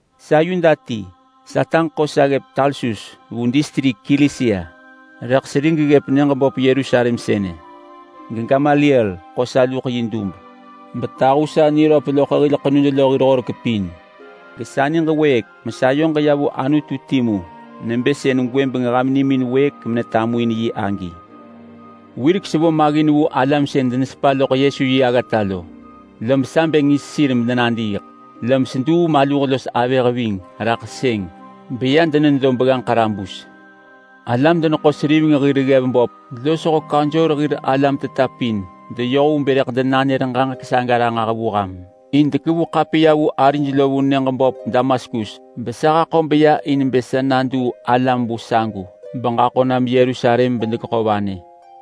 “Sa Yuda ti. Sataġ ḳo sa ggëp Tarsus vu distrik Kilisia, rëḳ serig ggëp nyëġ böp Yerusalem sënë geGamaliel ḳo sa luḳ yi dub betahu sa niröp loḳ hil ḳenud lo hir horek pin. Gesa niġ wëëk mesayoġ ya vu Anutu timu nebë sën gwëbeng ham nimin wëëk menetamuin yi agi. Wirek sevo maggin vu alam sën denesepa loḳ Yesu yi aggata lo, lob sa bë ngis sir medenadiiḳ. Lob seduu maluh los avëh ving raḳ sëng beya denedo begganġ ḳarabus. Alam-deneḳo-seriveng hir ggev böp losho kaunsor hir alam teta pin deyoh vu bë rëḳ denanër ġaġek saga ranġah vu ham, in dekevu ḳapiya vu arij lo vu nyëġ böp Damaskus besa haḳo beya in bë sa naduu alam vu sagu beġaḳo nam Yerusalem bedegeḳo vanë.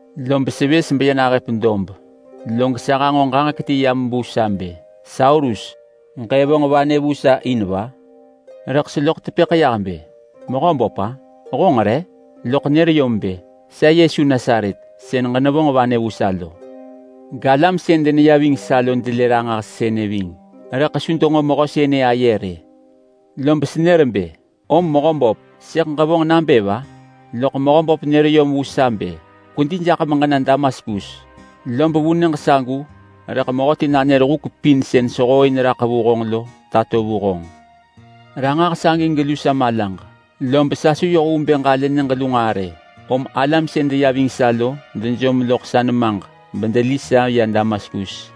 Lob sevës beya nahëp dob, log sa hanġo ġaġek ti yam vu sa bë, ‘Saulus, ġëvonġ vanë vu sa in va?’ Rëḳ seloḳ tepëḳ yah bë, ‘Mehöböp-a? Honġ re?’ Loḳ nër yom bë, ‘Sa Yesu Nasaret sën ġenevonġ vanë vu sa lo!’ Galam sën deneya ving sa lo delë ranġah sënë ving, rëḳ su denġo mehö sënë aye rë. Lob senër bë, ‘Om Mehöböp, sëḳ ġevonġ nabë va?’ Loḳ Mehöböp nër yom vu sa bë, ‘Kwedi jaḳ meġena Damaskus. Lob vu nyëġ sagu rëḳ mehöti nanër huk pin sën sehooin raḳ vu honġ lo tato vu honġ.’ Ranġah sagi gelu sa malaġ, lob sa su yoh vu bë ġalë nyëġ lu nġaa rë, om alam sën deya ving sa lo dejom loḳ sa nemaġ bedeli sa ya Damaskus.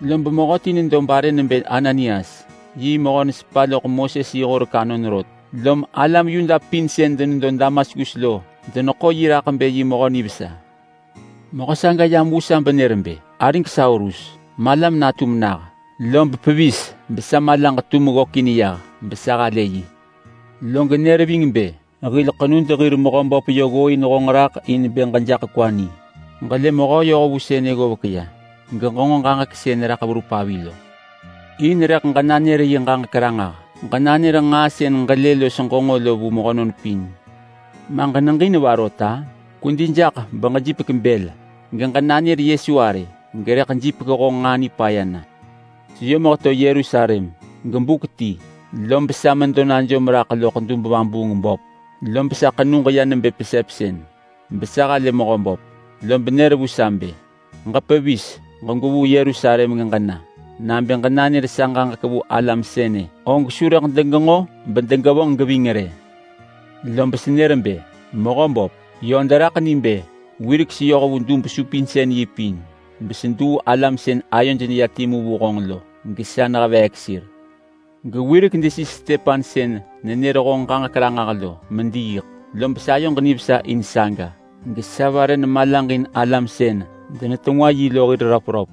Lob mehöti nedo barë nebë Ananias. Yi mehö nesepa loḳ Moses yi horek anon rot, lom alam Yuda pin sën denedo Damaskus lo deneḳo yi raḳ bë yi mehö nivesa. Mehö saga yam vu sa benër bë, ‘Arig Saulus! Malam natum nah!’ Lob pevis besa malaġ tum ggökin yah besa halë yi. Log nër ving bë, ‘Hil ḳenud hir Mehöböp yö ggooin honġ raḳ in bë gejaḳ kwa ni. Ġelë Mehö yohvu sënë ggovek ya, geġenġo ġaġek sën raḳ verup avi lo. In rëḳ ġenanër yi ġaġek ranġah. Ġenanër nġaa sën ġelë los ġenġo lo vu mehönon pin. Ma ġeneġin va rot-a? Kwedi jaḳ beġejipek bël. Ġenanër Yesu arë gerëḳ jipek honġ nġaa nipaya na.’” “Seyom heto Yerusalem, gebuk ti lob sa medo najom raḳ loḳ dub-vabuung-böp, lob sa ḳenug ya nebë pesepsën besa halë Mehöböp. Lob nër vu sa bë, ‘Ġepevis! Gwevuu Yerusalem geġena! Nabë ġenanër sa ġaġek vu alam sënë og su rëḳ degenġo bedegevonġ geving rë!’ Lob senër bë, ‘Mehöböp, yö deraḳ ni bë wirek seyoh vu dub-supinsën-yi pin beseduu alam sën ayoj neya timu vu honġ lo, gesa neheveek sir. Gewirek desis Stepan sën nenër honġ ġaġek ranġah lo mediiḳ, lob sayoġ nivesa in saga gesa vare nemalaġin alam sën denetengwa yi lo hir röpröp.’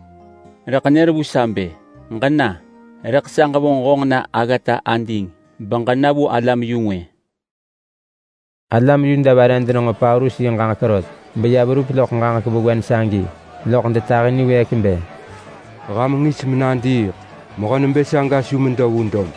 Rëḳ nër vu sa bë, ‘Ġena! Rëḳ sa ġevonġ honġ na aggata ading beġena vu alam-yu-ngwë.’” Alam Yuda vare denenġo Paulus yi ġaġek rot beya verup loḳ ġaġek vewen sagi loḳ detahi niwëëk bë, “Ham jaḳ na genadiiḳ! Mehö nebë saga su medo vesa!”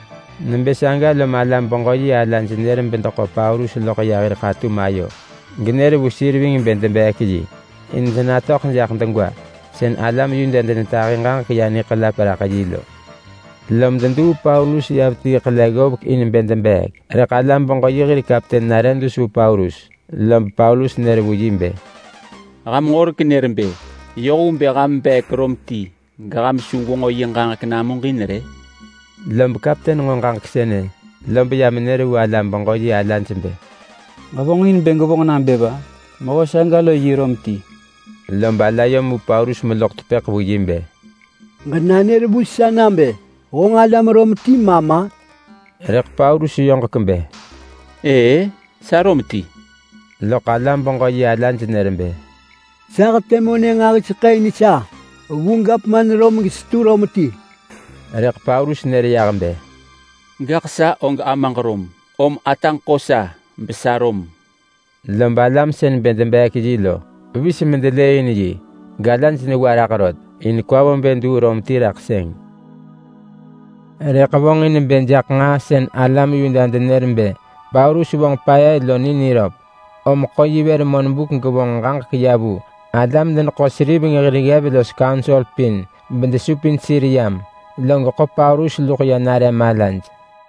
Nebë saga lob alam-beġö-yi alaj nër bedeḳo Paulus loḳ ya hir ḳatum ayo. Genër vu sir ving bë debeek yi in denatöḳ jaḳ degwa sën alam Yuda denetahi ġaġek ya niḳelap raḳ yi lo. Lom deduu Paulus ya vetii ḳele ggovek in bë debeek, rëḳ alam-beġö-yi hir kapten nare dus vu Paulus, lob Paulus nër vu yi bë, “Ham horek nër bë yoh vu bë ham beek Rom ti geham su gwenġo yi ġaġek namuġin rë?” Lob kapten nġo ġaġek sënë, lob ya menër vu alam-beġö-yi alaj bë, “Ġevonġin bë gwevonġ nabë va? Mehö saga lo yi Rom ti!” Lob ala yom vu Paulus meloḳ tepëḳ vu yi bë, “Ġenanër vu sa nabë honġ alam Rom ti ma ma?” Rëḳ Paulus yoġek bë, “Ëë-ë, sa Rom ti!” Loḳ alam-beġö-yi alaj nër bë, “Sa hetë monë nġahiseḳë in sa vu gavman Rom gesetu Rom ti!” Rëḳ Paulus nër yah bë, “Gaḳ sa og amaġ Rom, om ataġ ḳo sa besa Rom.” Lob alam sën bë debeek yi lo pevis bedelëëin yi, galaj newa raḳ rot in kwa vo bë duu Rom ti raḳ sëng. Rëḳ vonġin bë jaḳ nġaa sën alam Yuda denër bë Paulus vonġ paya lo ni niröp, om ḳo yi vër monbuk gevonġ ġaġek ya vu alam-deneḳo-seriveng hir ggev los kaunsor pin bedesupin sir yam, log ḳo Paulus luḳ ya nare malaj.